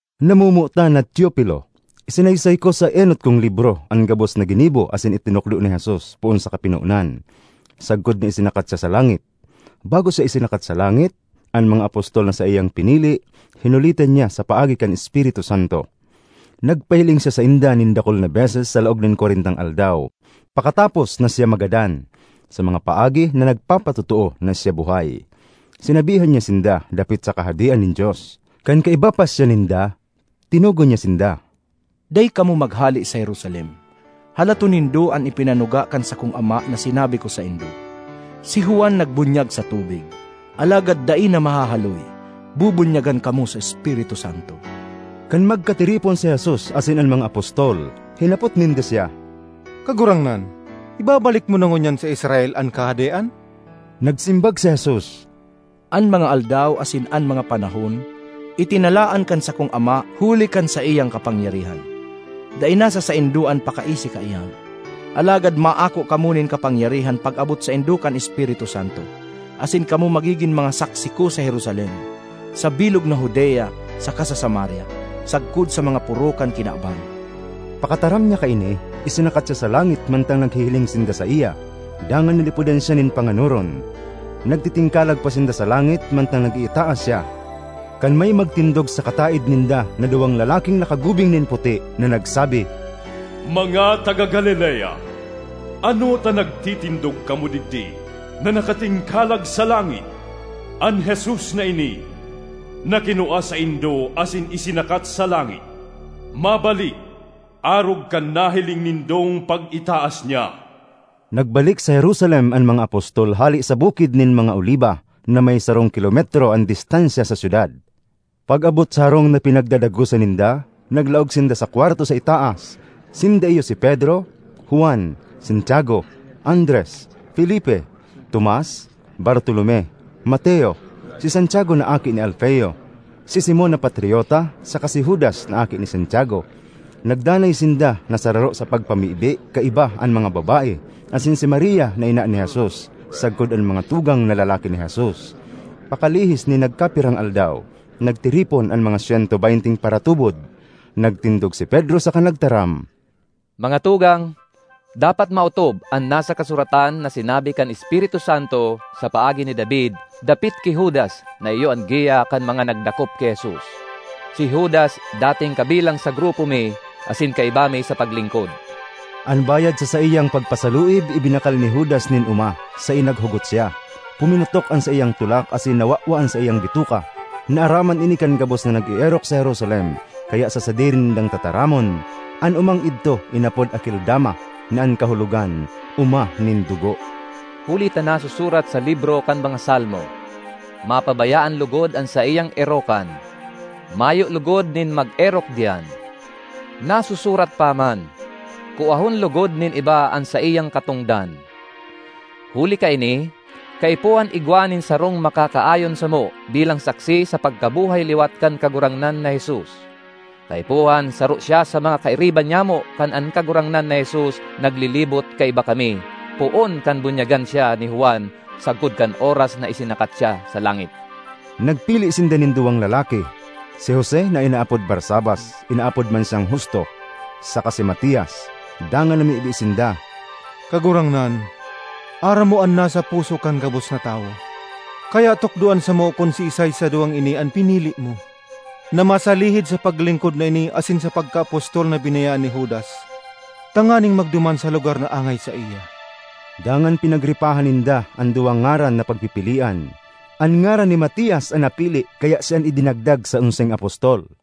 Namomotan na Teofilo: Isinaysay ko sa enot kong libro an gabos na ginibo asin itinukdo ni Jesus, poon sa kapinonan sagkod na isinakat siya sa langit. Bago siya isinakat sa langit, an mga apostol na saiyang pinili hinulitan niya sa paagi kan Espiritu Santo. Nagpahiling siya sainda nin dakul na beses sa laog nin kwarentang aldaw pakatapos na siya magadan, sa mga paagi na nagpapatotoo na siya buhay. Sinabihan niya sinda dapit sa Kahadean nin Dios. Kan kaiba pa siya ninda, tinugon niya sinda, “Dai kamo maghale sa Jerusalem. Halaton nindo an ipinanuga kan sakong Ama na sinabi ko saindo. Si Juan nagbunyag sa tubig, alagad dai na mahahaloy bubunyagan kamo sa Espiritu Santo.” Kan magkatiripon si Jesus asin an mga apostol, hinapot ninda siya, “Kagurangnan, ibabalik mo na ngunyan sa Israel an Kahadean?” Nagsimbag si Jesus, “An mga aldaw asin an mga panahon itinalaan kan sakong Ama huli kan saiyang kapangyarihan; dai nasa saindo an pakaisi kaiyan. Alagad maako kamo nin kapangyarihan pag-abot saindo kan Espiritu Santo asin kamo magigin mga saksi ko sa Jerusalem, sa bilog na Judea saka sa Samaria, sagkod sa mga poro kan kinaban.” Pakataram niya kaini, isinakat siya sa langit mantang naghihiling sinda saiya; dangan nalipodan siya nin panganoron. Nagtitingkalag pa sinda sa langit mantang nag-iitaas siya, kan may magtindog sa kataed ninda na duwang lalaking nakagubing nin puti, na nagsabi, “Mga taga Galilea, ano ta nagtitindog kamo digdi na nakatingkalag sa langit? An Jesus na ini, na kinua saindo asin isinakat sa langit, mabalik arog kan nahiling nindong pag-itaas niya.” Nagbalik sa Jerusalem an mga apostol hale sa Bukid nin mga Oliba, na may sarong kilometro an distansya sa syudad. Pag-abot sa harong na pinagdadagosan ninda, naglaog sinda sa kwarto sa itaas: sinda iyo si Pedro, Juan, Santiago, Andres, Felipe, Tomas, Bartolome, Mateo, si Santiago na aki ni Alfeo, si Simon na Patriota saka si Judas na aki ni Santiago. Nagdanay sinda na sararo sa pagpamibi kaiba an mga babae, asin si Maria na ina ni Jesus, sagkod an mga tugang na lalaki ni Jesus. Pakalihis nin nagkapirang aldaw, nagtiripon an mga syento beynteng paratubod. Nagtindog si Pedro saka nagtaram, ”Mga tugang, dapat maotob an nasa kasuratan na sinabi kan Espiritu Santo sa paagi ni David dapit ki Judas na iyo an giya kan mga nagdakop ki Jesus. Si Judas dating kabilang sa grupo mi asin kaiba mi sa paglingkod.” (An bayad sa saiyang pagpasaluib ibinakal ni Judas nin oma, saen naghugot siya; puminutok an saiyang tulak asin nawawa an saiyang bituka. Naaraman ini kan gabos na nag-eerok sa Jerusalem, kaya sa sadiri nindang tataramon, an omang idto inapod Akeldama, na an kahulogan “Oma nin Dugo.”) ”Huli ta nasusurat sa libro kan mga Salmo, ‘Mapabayaan logod an saiyang erokan; mayo logod nin mag-erok diyan.’ Nasusurat pa man, ‘Kuahon logod nin iba an saiyang katongdan.’ ”Huli kaini, kaipuhan igwa nin sarong makakaayon samo bilang saksi sa pagkabuhay-liwat kan Kagurangnan na Jesus. Kaipuhan saro siya sa mga kairiba nyamo kan an Kagurangnan na Jesus naglilibot kaiba kami poon kan bunyagan siya ni Juan sagkod kan oras na isinakat siya sa langit.” Nagpili sinda nin duwang lalaki: si Jose na inaapod Barsabas (inaapod man siyang Husto), saka si Matias. Dangan namibi sinda, “Kagurangnan, aram mo an nasa puso kan gabos na tawo. Kaya tukdoan samo kun siisay sa duwang ini an pinili mo na masalihid sa paglingkod na ini asin sa pagkaapostol na binayaan ni Judas tanganing magduman sa lugar na angay saiya.” Dangan pinagripahan ninda an duwang ngaran na pagpipilian. An ngaran ni Matias an napili kaya siya an idinagdag sa onseng apostol.